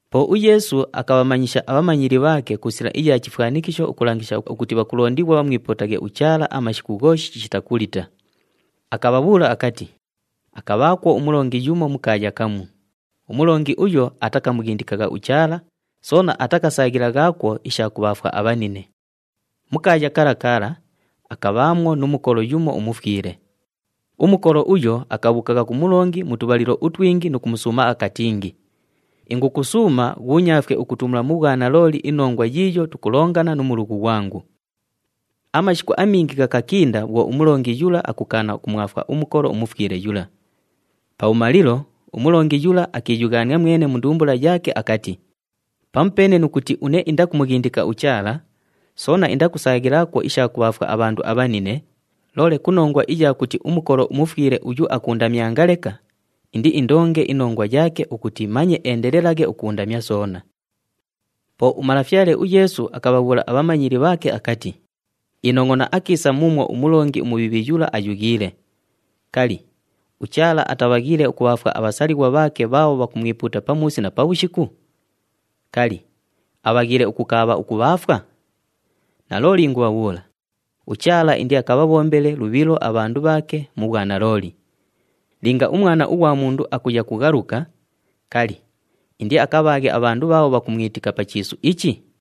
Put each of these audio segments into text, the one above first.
Po uYeesu akabhamanyisha abhamanyili bhaake ku sila iya chifwanikisho ukulangisha ukuti bhakulondighwa bhamwipuutaghe uChaala amashiku ghooshi chishita kulita. Akabhabhuula akati, “Akabhaakwo umulongi yumo mu kaaya kamu. Umulongi uyo atakamughindikagha uChaala, soona atakasaaghilaghaakwo isha kubhaafwa abhanine. Mu kaaya kala kala, akabhaamwo nu mukolo yumo umufwile. Umukolo uyo akabhuukagha ku mulongi mu tubhalilo utwingi nu kumusuuma akatingi, ‘Ingukusuuma ghuunyaafwe ukutumula mu bhwanalooli inongwa yiiyo tukulongana nu mulughu ghwangu.’ “Amashiku amingi ghakakinda bhwo umulongi yula akukaana ukumwafwa umukolo umufwile yula. Pabhumalilo, umulongi yula akiiyughaania mwene mu ndumbula yaake akati, ‘Pamupeene nu kuti une indakumughindika uChaala, soona indakusaaghilaakwo isha kubhaafwa abhandu abhanine, loole ku nongwa iya kuti umukolo umufwile uyu akuundamyanga leka, indiindonge inongwa yaake ukuti manye eendelelaghe ukuundamya soona.’” Po uMalafyale uYeesu akabhabhuula abhamanyili bhaake akati, “Inongʼona akiisa muumwo umulongi umubhiibhi yula aayughiile! Kali, uChaala atabhaghiile ukubhaafwa abhasalighwa bhaake bhaabho bhakumwipuuta pamuusi na pabhushiku? Kali, abhaghiile ukukaabha ukubhaafwa? Nalooli ingubhabhuula, uChaala indiakabhabhombele lubhilo abhandu bhaake mu bhwanalooli. Linga uMwana ughwa Mundu akuya kughaluka, kali, indiakabhaaghe abhandu bhaabho bhakumwitika pa chiisu ichi?”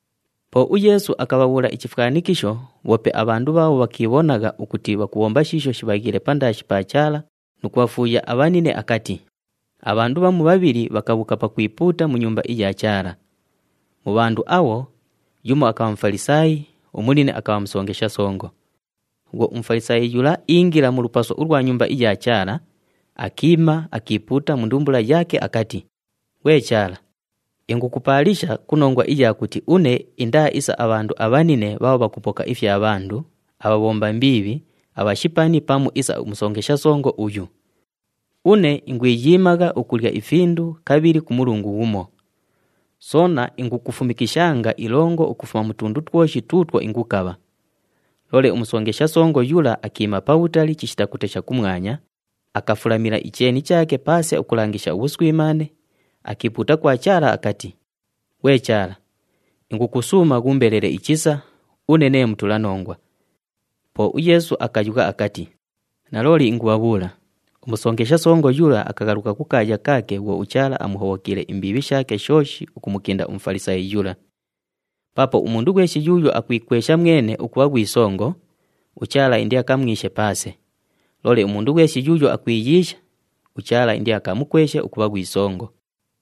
Po uYeesu akabhabhuula ichifwanikisho bhoope abhandu bhaabho bhakiibhonagha ukuti bhakubhomba shiisho shibhaghiile pandaashi pa Chaala nu kubhafuuya abhanine akati, “Abhandu bhamu bhabhili bhakabhuuka pakwipuuta mu Nyumba iya Chaala. Mu bhandu abho, yumo akabha Mufalisaayi, umunine akabha musongesha songo. Bhwo uMufalisaayi yula iingila mu lupaso ulwa Nyumba iya Chaala, akiima, akiipuuta mu ndumbula yaake akati, ‘Ghwe Chaala, ingukupaalisha ku nongwa iya kuti une indaa isa abhandu abhanine bhaabho bhakupoka ifya bhandu, abhabhomba mbiibhi, abhashipani pamu isa umusongesha songo uyu. Une ingwiyiimagha ukulya ifindu kabhili ku mulungu ghumo. Soona ingukufumikishanga ilongo ukufuma mu tundu twoshi tuutwo ingukabha.’ Loole umusongesha songo yula akiima pabhutali chishita kutesha kumwanya, akafulamila icheeni chaake paase ukulangisha ubhuswimaane, akiipuuta kwa Chaala akati, ‘Ghwe Chaala, ingukusuuma ghuumbelele ichisa, une nee mutulanongwa.’” Po uYeesu akayugha akati, “Nalooli ingubhabhuula, umusongesha songo yula akaghaluka kukaaya kaake bhwo uChaala amuhobhokiile imbiibhi shaake shooshi ukumukinda uMufalisaayi yula. Paapo umundu ghweshi yuuyo akwikwesha mwene ukubha ghwi songo, uChaala indiakamwishe paase. Loole umundu ghweshi yuuyo akwiyiisha, uChaala indiakamukweshe ukubha ghwi songo.”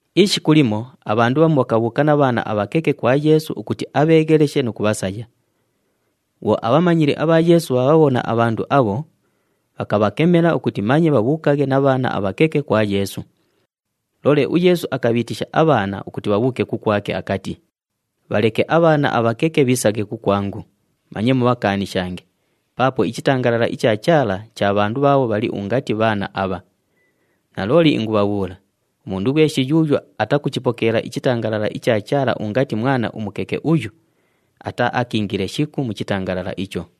Ishiku limo abhandu bhamu bhakabhuuka na bhaana abhakeke kwa Yeesu ukuti abheegheleshe nu kubhasaya. Bhwo abhamanyili abha Yeesu bhaabhabhona abhandu abho, bhakabhakemela ukuti manye bhabhuukaghe na bhaana abhakeke kwa Yeesu. Loole uYeesu akabhiitisha abhaana ukuti bhabhuuke kukwake, akati, “Bhaleke abhaana abhakeke bhiisaghe kukwangu, manye mubhakaanishange, paapo ichitangalala icha Chaala cha bhandu bhaabho bhali ungati bhaana abha. Nalooli ingubhabhuula, umundu ghweshi yuuyo atakuchipokeela ichitangalala icha Chaala ungati mwana umukeke uyu, ataaakiingile shiku mu chitangalala icho.”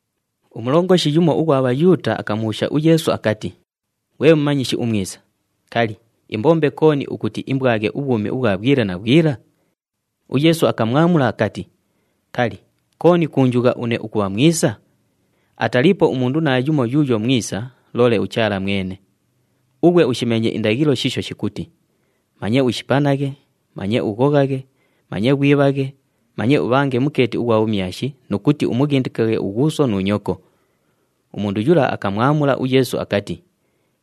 Umulongoshi yumo ughwa Bhayuuta akamubhuusha uYeesu akati, “Ghwe Mumanyishi umwisa, kali, imbombe kooni ukuti imbwaghe ubhwumi ubhwa bhwila na bhwila?” UYeesu akamwamula akati, “Kali, kooni kuunjugha une ukubha mwisa? Ataliipo umundu naayumo yuuyo mwisa, loole uChaala mwene. Ughwe ushimeenye indaghilo shiisho shikuti, ‘Manye ushipanaghe, manye ughoghaghe, manye ghwibhaghe, manye ubhange mukeeti ughwa bhumyashi nu kuti umughindikaghe ughuuso nu nyoko.’” Umundu yula akamwamula uYeesu akati,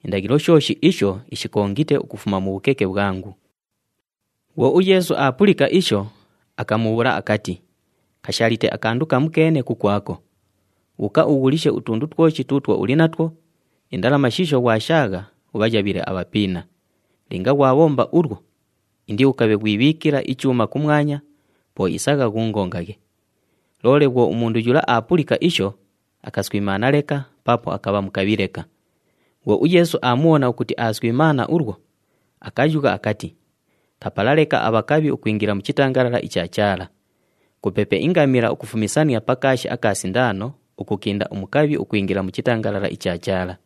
“Indaghilo shooshi isho ishikongite ukufuma mu bhukeke bhwangu.” Bhwo uYeesu aapulika isho, akamubhuula akati, “Kashaalite akandu kamukeene kukwako. Bhuuka ughulishe utundu twoshi tuutwo uli natwo, indalama shiisho ghwashaagha, ubhayabhile abhapiina. Linga ghwabhomba ulwo, indiukabhe ghwibhiikila ichuuma kumwanya, po isagha ghuungongaghe.” Loole bhwo umundu yula aapulika isho, akaswimaana leka paapo akabha mukabhi leka. Bhwo uYeesu aamubhona ukuti aaswimaana ulwo, akayugha akati, “Kapala leka abhakabhi ukwingila mu chitangalala icha Chaala! Kupepe ingamila ukufumisania pa kaashi aka sindaano ukukinda umukabhi ukwingila mu chitangalala icha Chaala!”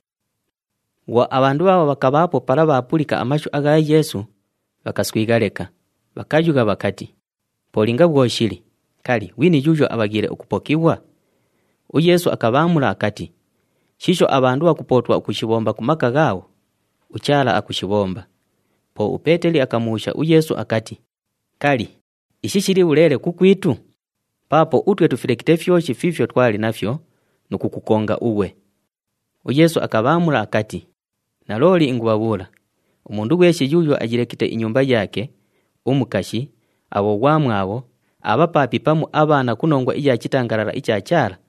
Bhwo abhandu bhaabho bhakabhaapo pala bhaapulika amashu agha Yeesu, bhakaswigha leka, bhakayugha bhakati, “Po linga bhwo shili, kali, ghwini yuuyo abhaghiile ukupokighwa?” UYeesu akabhaamula akati, “Shiisho abhandu bhakupootwa ukushibhomba ku maka ghaabho, uChaala akushibhomba.” Po uPeeteli akamubhuusha uYeesu akati, “Kali, ishi shili bhuleele kukwitu? Paapo utwe tufilekite fyoshi fiifyo twali nafyo nu kukukonga ughwe!” UYeesu akabhaamula akati, “Nalooli ingubhabhuula, umundu ghweshi yuuyo ayilekite inyumba yaake, umukashi, abhoghwamwabho, abhapaapi pamu abhaana ku nongwa iya chitangalala icha Chaala,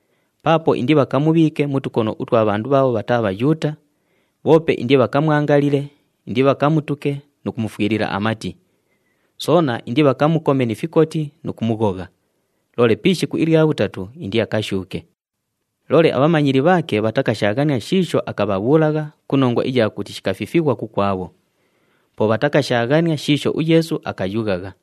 Paapo indibhakamubhiike mu tukono utwa bhandu bhaabho bhataa Bhayuuta, bhoope indibhakamwangalile, indibhakamutuke nu kumufwilila amati. Soona indibhakamukome ni fikoti nu kumughogha, loole pi ishiku ilya bhutatu, indiakashuuke.” Loole abhamanyili bhaake bhatakashaaghania shiisho akabhabhuulagha ku nongwa iya kuti shikafifighwa kukwabho. Po bhatakashaaghania shiisho uYeesu akayughagha.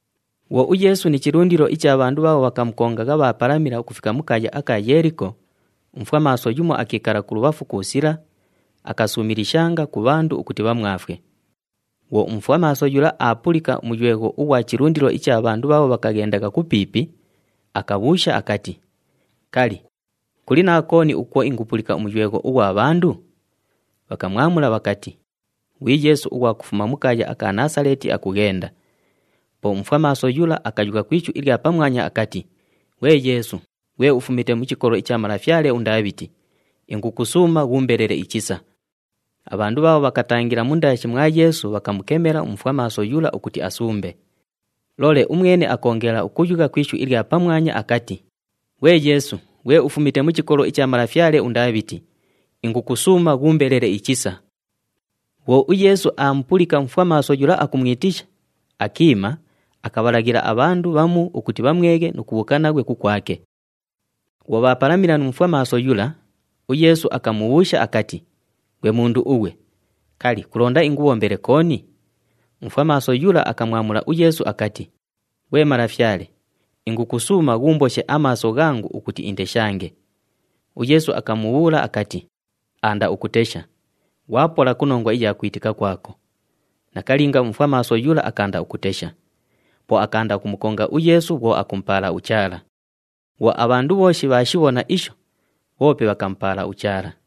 Bhwo uYeesu ni chilundilo icha bhandu bhaabho bhakamukongagha bhaapalamila ukufika mu kaaya aka Yeeliko, umufwamaaso yumo akiikala kulubhafu ku sila, akasuumilishanga ku bhandu ukuti bhamwafwe. Bhwo umufwamaaso yula aapulika umuywegho ughwa chilundilo icha bhandu bhaabho bhakaghendagha kupiipi, akabhuusha akati, “Kali, kuli na kooni ukwo ingupulika umuywegho ughwa bhandu?” Bhakamwamula bhakati, “Ghwi Yeesu ughwa kufuma mu kaaya aka Naasaleeti akughenda.” Po umufwamaaso yula akayugha ku ishu ilya pamwanya akati, “Ghwe Yeesu, ghwe ufumite mu chikolo icha malafyale uNdaabhiti, ingukusuuma ghuumbelele ichisa!” Abhandu bhaabho bhakatangila mundaashi mwa Yeesu bhakamukemela umufwamaaso yula ukuti asumbe. Loole umwene akoongela ukuyugha ku ishu ilya pamwanya akati, “Ghwe Yeesu, ghwe ufumite mu chikolo icha malafyale uNdaabhiti, ingukusuuma ghuumbelele ichisa!” Bhwo uYeesu aamupulika umufwamaaso yula akumwitisha, akiima, akabhalaghila abhandu bhamu ukuti bhamweghe nu kubhuuka naghwe kukwake. Bhwo bhaapalamila nu mufwamaaso yula, uYeesu akamubhuusha akati, “Ghwe mundu ughwe, kali, kulonda ingubhombele kooni?” Umufwamaaso yula akamwamula uYeesu akati, “Ghwe Malafyale, ingukusuuma ghuumboshe amaaso ghangu ukuti indeshange.” UYeesu akamubhuula akati, “Aanda ukutesha! Ghwapola ku nongwa iya kwitika kwako.” Nakalinga, umufwamaaso yula akaanda ukutesha. Po akaanda ukumukonga uYeesu bhwo akumupaala uChaala. Bhwo abhandu bhooshi bhaashibhona isho, bhoope bhakamupaala uChaala.